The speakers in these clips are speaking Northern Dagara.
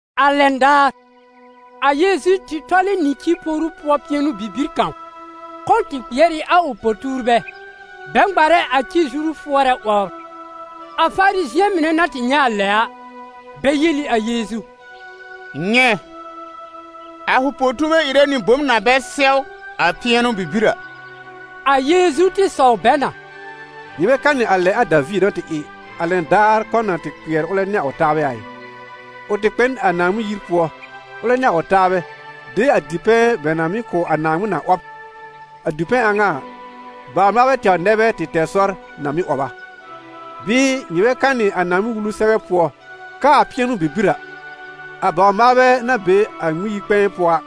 A lɛn daar, a Yeezu tɩ tɔlɛ nɩ ci poru pʋɔ pɩɛnʋ-bibir kãw. Kɔ̃ tɩ kpɩɛr ɩ a ʋ po-tuurbɛ, bɛ ŋmarɛ a ci-zuru fʋɔrɛ 'wɔbr. A Farizɩ̃ɛ mɩnɛ na tɩ nyɛ̃ a lɛ a, bɛ yel ɩ a Yeezu: «Nyɛ̃, a fʋ po-tuurbɛ ɩrɛ nɩ bom na bɛ sɛw a pɩɛnʋ bibir a!» A Yeezu tɩ sɔw bɛ na: «Nyɩ bɛ kanɩ a lɛ a Daviir na tɩ ɩ, a lɛn daar kɔ̃ na tɩ kpɩɛr ʋlɛ nɩ a ʋ taabɛ a ɩ? Ʋ tɩ kpɛ n a Naaŋmɩn yir pʋɔ, ʋlɛ nɩ a ʋ taabɛ, de a dipɛ̃ bɛ na mɩ́ kʋ̀ a Naaŋmɩn a 'wɔb, a dipɛ̃ a ŋa a, a bawr-maalbɛ tɛwr nɛ bɛ tɩ tɛr sɔr na mɩ́ 'wɔb a. Bɩɩ nyɩ bɛ kanɩ a Naaŋmɩn-Wulu sɛbɛ pʋɔ, k'aa pɩɛnʋ-bibir a, a bawr-maalbɛ na be a Ŋmɩn-yi-kpɛ̃ɛ pʋɔ a,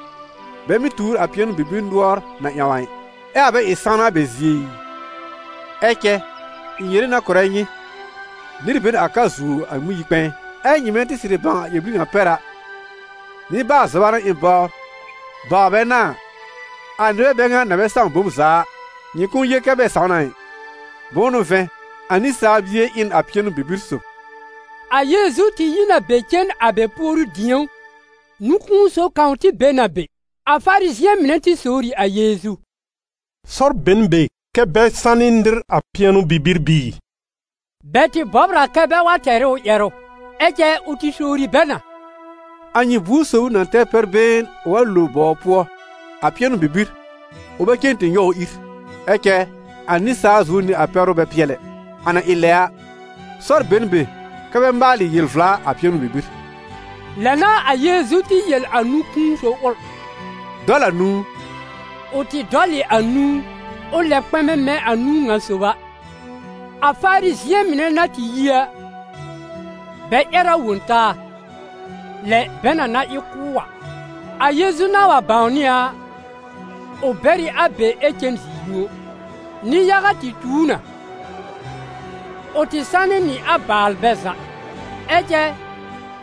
bɛ mɩ́ tuur a pɩɛnʋ-bibir nʋɔr na ƴãw a ɩ, ɛ a bɛ ɩ sãwna a bɛ zie ɩ? Ɛ cɛ ɩ̃ yere na kʋ̀rɛ nyɩ, nɩr be n a ka zuo a Ŋmɩn-yi-kpɛ̃ɛ. Ɛ nyɩmɛ tɩ sɩrɩ bãw a ƴɛr-bir ŋa pɛr a: ‹Nɩbaal-zɔba n'a ɩ̃ bɔbr, bawr bɛ n'a a›, a nɩbɛ bɛ ŋa na bɛ sãw bom za a, nyɩ kʋ̃ʋ yel kɛ bɛ sãw na ɩ. Bʋ̃ʋ n'ʋ vɛ̃, a Nɩsaal Bie ɩ n a pɩɛnʋ-bibir sòb.» A Yeezu tɩ yi n a be cen a bɛ puoru-dĩ̀ó. Nũ-kũu sob kãw tɩ be n a be. A Farizɩ̃ɛ mɩnɛ tɩ sowr ɩ a Yeezu: «Sɔr be n be kɛ́ bɛ sanɩ nɩr a pɩɛnʋ-bibir bɩɩ?» Bɛ tɩ bɔbr a kɛ bɛ wa tɛr ɩ ʋ ƴɛrʋ. Ɛ cɛ ʋ tɩ sowri bɛ na: «A nyɩ buor sob ʋ na tɛr pɛr-been ʋ wa lo bɔw pʋɔ a pɩɛnʋ-bibir, ʋ bɛ cen tɩ nyɔw ʋ ír? Ɛ cɛ a nɩsaal zuo nɩ a pɛ́rʋ bɛ pɩɛl ɛ! A na ɩ lɛ a, sɔr be n be kɛ bɛ maalɩ yel-vla a pɩɛnʋ-bibir.» Lɛ n'a a Yeezu tɩ yel a nũ-kũu sob ʋl: «Dɔl a nũu.» Ʋ tɩ dɔl ɩ a nũu, ʋ lɛb kpɛ̃mɛ mɛ̃ a nũu ŋa sob a. A Farizɩ̃ɛ mɩnɛ na tɩ yi a, bɛ ƴɛr a wõ taa, lɛ bɛ na na ɩ kʋ́ ʋ a. A Yeezu na wa bãwnɩ a a, ʋ bɛr ɩ a be ɛ cen zi-yũo. Nɩ-yaga tɩ tu ʋ na; ʋ tɩ sanɩ nɩ a baalbɛ za. Ɛ cɛ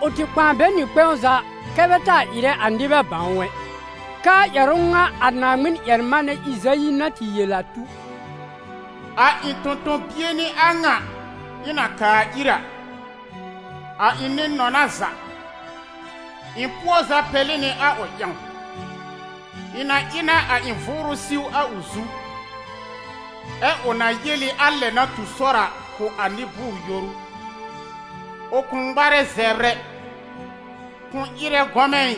ʋ tɩ kpãa bɛ nɩ kpɛ̃w za kɛ bɛ taa ɩrɛ a nɩbɛ bãw ʋ ɛ, k'aa ƴɛrʋ ŋa a Naaŋmɩn-ƴɛr-manɛ Ɩzayi na tɩ yel a tu: «A ɩ̃ tõ-tõ-bie n'ɩ a ŋa ɩ̃ na kaa ir a, a ɩ̃ nɩ-nɔna za, ɩ̃ pʋɔ za pɛlɩ nɩ a ʋ ƴãw. Ɩ̃ na ɩ na a ɩ̃ Vʋʋrʋ siw a ʋ zu, ɛ ʋ na yel ɩ a lɛ na tu sɔr a kʋ̀ a nɩ-bʋʋr-yoru. Ʋ kʋ̃ ŋmarɛ zɛbr ɛ, kʋ̃ ɩrɛ gɔmɛ̃ ɩ,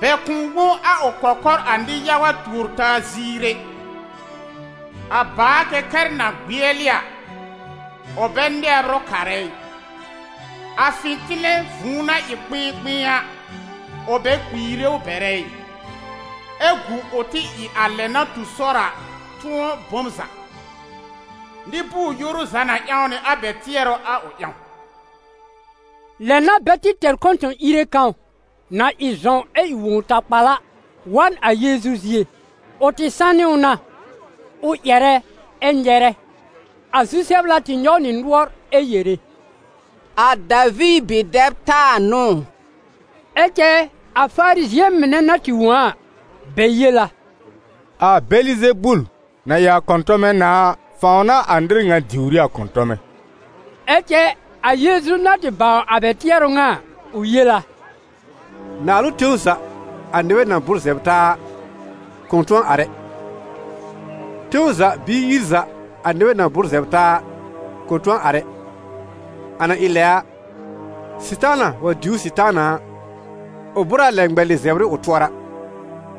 bɛ kʋ̃ wõ a ʋ kɔkɔr a nɩ-yaga tuor-taa ziir ɛ. A bàa-kɛkɛr na gbɩɛlɩ a, ʋ bɛ nɛbr ʋ karɛ ɩ, a fɩ̃tɩlɛ vũu na ɩ kpɩ̃ɩkpɩ̃ɩ a, ʋ bɛ kpiire bɛrɛ ɩ, ɛ gu ʋ tɩ ɩ a lɛ na tu sɔr a tʋ̃ɔ bom za. Nɩ-bʋʋr-yoru za na ƴãw nɩ a bɛ tɩɛrʋ a ʋ ƴãw.» Lɛ n'a bɛ tɩ tɛr kɔ̃tɔ̃-ìre kãw, na ɩ zɔ̃w ɛ ɩ wõw-takpal a, wa n a Yeezu zie; ʋ tɩ sanɩ ʋ na, ʋ ƴɛrɛ ɛ nyɛrɛ. A zu-sɛbla tɩ nyɔw nɩ nʋɔr ɛ yere: «A Daviir bi-dɛb taa n'ʋ ʋ?» Ɛ cɛ a Farizɩ̃ɛ mɩnɛ na tɩ wõ a a, bɛ yel a: «A Bɛlɩzebul, na ɩ a kɔ̃tɔmɛ nãá a, fãw n'a a nɩr ŋa diwr ɩ a kɔ̃tɔmɛ.» Ɛ cɛ a Yeezu na tɩ bãw a bɛ tɩɛrʋ a ŋa a, ʋ yel a: «Naalʋ tẽw za, a nɩbɛ na bʋ́r zɛbr taa a, kʋ̃ tʋ̃ɔ ar ɛ. Tẽw za bɩɩ yir za, a nɩbɛ na bʋ́r zɛbr taa a, kʋ̃ tʋ̃ɔ ar ɛ. A na ɩ lɛ a, Sɩtaana wa diwr Sɩtaana a, ʋ bʋ́r a lɛ ŋmɛlɩ zɛbr ɩ ʋ tʋɔra;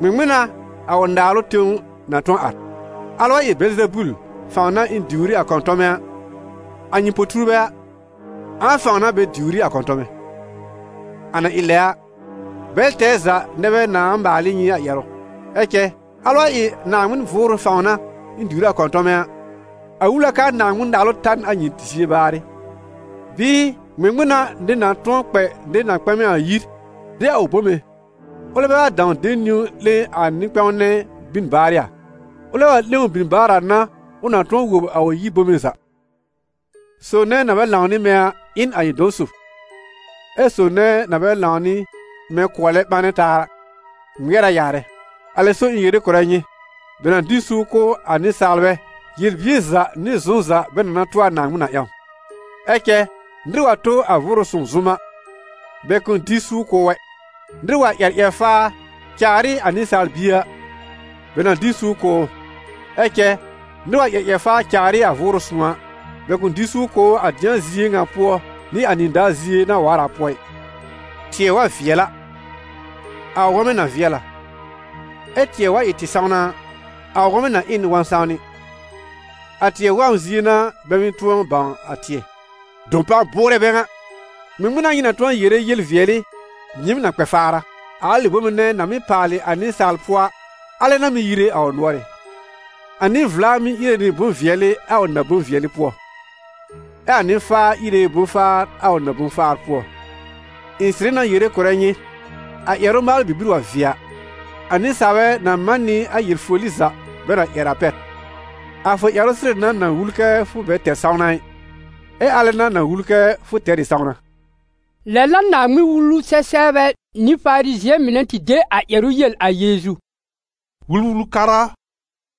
ŋmɩŋmɩn n'a a ʋ naalʋ tẽw na tʋ̃ɔ ar? Alɛ wa ɩ Bɛlɩzebul fãw n'a ɩ̃ diwr ɩ a kɔ̃tɔmɛ a, a nyɩ po-tuurbɛ a, ãa fãw n'a bɛ diwr ɩ a kɔ̃tɔmɛ? A na ɩ lɛ a, bɛl tɛɛ za nɛ bɛ nãá maal ɩ nyɩ a ƴɛrʋ. Ɛ cɛ alɛ wa ɩ a Naaŋmɩn Vʋʋrʋ fãw n'a ɩ̃ diwr ɩ a kɔ̃tɔmɛ a, a wul a k'aa Naaŋmɩn-Naalʋ ta n a nyɩ zie baarɩ. Bɩɩ, ŋmɩŋmɩn n'a nɩr na tʋ̃ɔ kpɛ nɩr na kpɛ̃mɛ yir, de a ʋ bome, ʋlɛ bɛ wa dãw de niwn'lẽ a nɩ-kpɛ̃w nɛ bin baarɩ a? Ʋlɛ wa 'lẽ ʋ bin baar a n'a ʋ na tʋ̃ɔ wob a ʋ yir bome za. Sob nɛ na bɛ lãw nɩ mɛ̃ a, ɩ n a ɩ̃ dɔ̃ dob, ɛ sob nɛ na bɛ lãw nɩ mɛ̃ kʋɔlɛ ɓanɛ taa a, ŋmɩɛr a yaarɛ. Alɛ so ɩ̃ yere kʋ̀rɛ nyɩ, bɛ na dɩ n suur kʋ̀ a nɩsaalbɛ, yel-bier za nɩ zʋm za bɛ na na tʋ a Naaŋmɩn a ƴãw, ɛ cɛ nɩr wa tʋ a Vʋʋrʋ Sõw zʋm a, bɛ kʋ̃ dɩ suur kʋ̀ ʋ ɛ. Nɩr wa ƴɛr ƴɛr-faa caar ɩ a Nɩsaal Bie a, bɛ na dɩ n suur kʋ̀ ʋ, ɛ cɛ nɩr wa ƴɛr ƴɛr-faa caar ɩ a Vʋʋrʋ Sõw a, bɛ kʋ̃ dɩ suur kʋ̀ ʋ a dɩ̃a zie ŋa pʋɔ nɩ a nɩdaar zie na waar a pʋɔ ɩ.» «Tɩɛ wa vɩɛl a, a ʋ wɔmɛ na vɩɛl a, ɛ tɩɛ wa ɩ tɩ-sãwna a, a ʋ wɔmɛ na ɩ n wɔ̃-sãwnɩ. A tɩɛ wɔm zie n'a bɛ mɩ́ tʋ̃ɔ bãw a tɩɛ. Dɔpan bʋʋrɛ bɛ ŋa! Ŋmɩŋmɩn n'a nyɩ na tʋ̃ɔ yere yel-vɩɛlɩ nyɩɩm na kpɛ faar a? A alɩ bome nɛ na mɩ́ paalɩ a nɩsaal pʋɔ a, alɛ n'a mɩ́ yire a ʋ nʋɔrɩ́. A nɩ-vla mɩ́ íre nɩ bʋ̃-vɩɛlɩ a ʋ na-bʋ̃-vɩɛlɩ pʋɔ, ɛ a nɩ-faa íre bʋ̃-faar a ʋ na-bʋ̃-faar pʋɔ. Ɩ̃ sɩrɩ na yere kʋ̀rɛ nyɩ, a ƴɛrʋ-maalʋ bibir wa vɩɛ a, a nɩsaalbɛ na man nɩ a ƴɛr-foli za bɛ na ƴɛr a pɛr. A fʋ ƴɛrʋ sɩrɩ n'a na wul kɛ fʋ bɛ tɛr sãwna ɩ, ɛ alɛ n'a na wul kɛ fʋ tɛr ɩ sãwna.» Lɛ n'a Naaŋmɩn-Wulu-sɛ-sɛbrbɛ nɩ Farizɩ̃ɛ mɩnɛ tɩ de a ƴɛrʋ yel a Yeezu: «Wul-wul-kara a,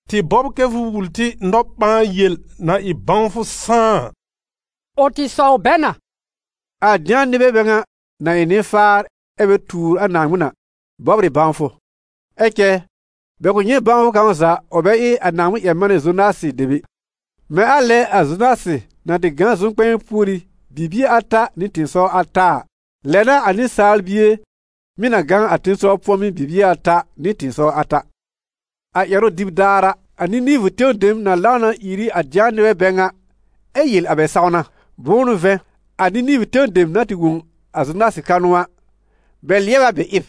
tɩ bɔbr kɛ fʋ wul tɩ nɔ-ɓãa-yel na ɩ bãwfʋ sãá a.» Ʋ tɩ sɔw bɛ na: «A dɩ̃a nɩbɛ bɛ ŋa, na ɩ nɩ-faar ɛ bɛ tuur Naaŋmɩn a, bɔbr ɩ bãwfʋ, ɛ cɛ bɛ kʋ̃ nyɛ̃ bãwfʋ kãw za ʋ bɛ ɩ a Naaŋmɩn-ƴɛr-manɛ Zonasɩ dem ɛ. Mɛ̃ a lɛ a Zonasɩ na tɩ gã a zʋm-kpɛ̃ɛ púorí bibie ata nɩ tɩ̃ɩsɔwr ata a, lɛ n'a a Nɩsaal Bie mɩ̀ na gã a tẽsɔw pʋ̃ɔmɩ́ bibie ata nɩ tɩ̃ɩsɔwr ata. A ƴɛrʋ-dɩb daar a, a Nɩnɩvʋ tẽw dem na lãw na ìr ɩ a dɩ̃a nɩbɛ bɛ ŋa, ɛ yel a bɛ sãwna. Bʋ̃ʋ n'ʋ vɛ̃, a Nɩnɩvʋ tẽw dem na tɩ wõ a Zonasɩ kanʋ a, bɛ lɩɛbɩ a bɛ ɩb.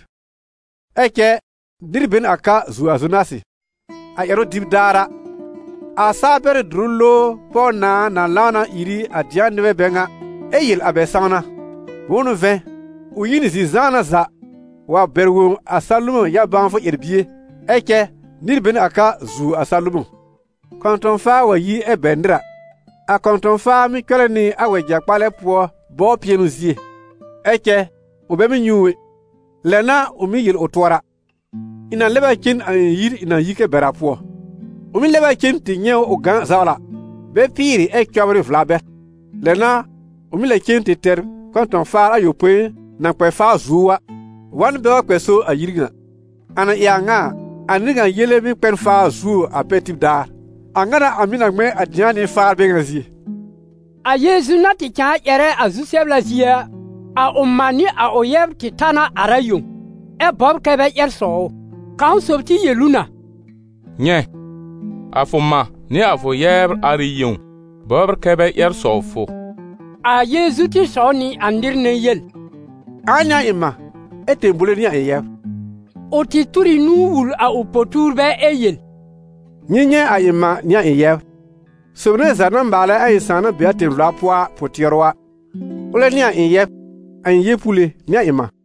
Ɛ cɛ nɩr bɛ n a ka zuo a Zonasɩ. A ƴɛrʋ-dɩb daar a, a saa-pɛrɩ́-dʋrʋ-lowr pɔw-nãà na lãw na ìr ɩ a dɩ̃a nɩbɛ bɛ ŋa, ɛ yel a bɛ sãwna. Bʋ̃ʋ n'ʋ vɛ̃, ʋ yi n zi-zãana za wa bɛr wõ a Salomɔ̃ yã-bãwfʋ ƴɛr-bie. Ɛ cɛ nɩr be n a ka zuo a Salomɔ̃.» « Kɔ̃tɔ̃-faa wa yi ɛ bɛr nɩr a, a kɔ̃tɔ̃-faa mɩ́ cɔlɛ nɩ a wɛja-kpalɛ bɔbr pɩɛnʋ zie, ɛ cɛ ʋ bɛ mɩ́ nyɛ̃ ʋ ɛ. Lɛ n'a ʋ mɩ́ yel ʋ tʋɔra: ‹Ɩ̃ na lɛb a cen a ɩ̃ yir ɩ̃ na yi kɛ bɛr a pʋɔ.› Ʋ mɩ́ lɛb a cen tɩ nyɛ̃ ʋ gã zawla, bɛ pɩɩrɩ ɛ cɔbrɩ vla bɛr. Lɛ n'a ʋ mɩ́ lɛ cen tɩ tɛr kɔ̃tɔ̃-faar ayopõi na kpɛ faa zuo ʋ a, wa n bɛ wa kpɛ so a yir ŋa. A na ɩ a ŋa a, a nɩr ŋa yele mɩ́ kpɛ n faa zuo a pɛr tib daar. A ŋa n'a a mɩ̀ na ŋmɛ̃ a dɩ̃a nɩ-faar bɛ ŋa zie.» A Yeezu na tɩ cãa ƴɛrɛ a zu-sɛbla zie a, a ʋ mã nɩ a ʋ yɛbr tɩ ta na ar a yẽw, ɛ bɔbr kɛ bɛ ƴɛr sɔw ʋ. [ Kãw sob tɩ yel ʋ na: «Nyɛ̃, a fʋ mã nɩ a fʋ yɛbr ar ɩ yẽw bɔbr kɛ bɛ ƴɛr sɔw fʋ.»] A Yeezu tɩ sɔw nɩ a nɩr nɛ yel: «Ãa n'ɩ a ɩ̃ mã, ɛ tẽbowle n'ɩ a ɩ̃ yɛbr?» Ʋ tɩ tur ɩ nũu wul a ʋ po-tuurbɛ ɛ yel: «Nyɩ nyɛ̃ a ɩ̃ mã nɩ a ɩ̃ yɛbr. Sob nɛ za na maalɛ a ɩ̃ Sãà na be a tẽ-vla pʋɔ a pʋ-tɩɛrʋ a, ʋlɛ n'ɩ a ɩ̃ yɛb, a ɩ̃ yeepuule nɩ a ɩ̃ mã.»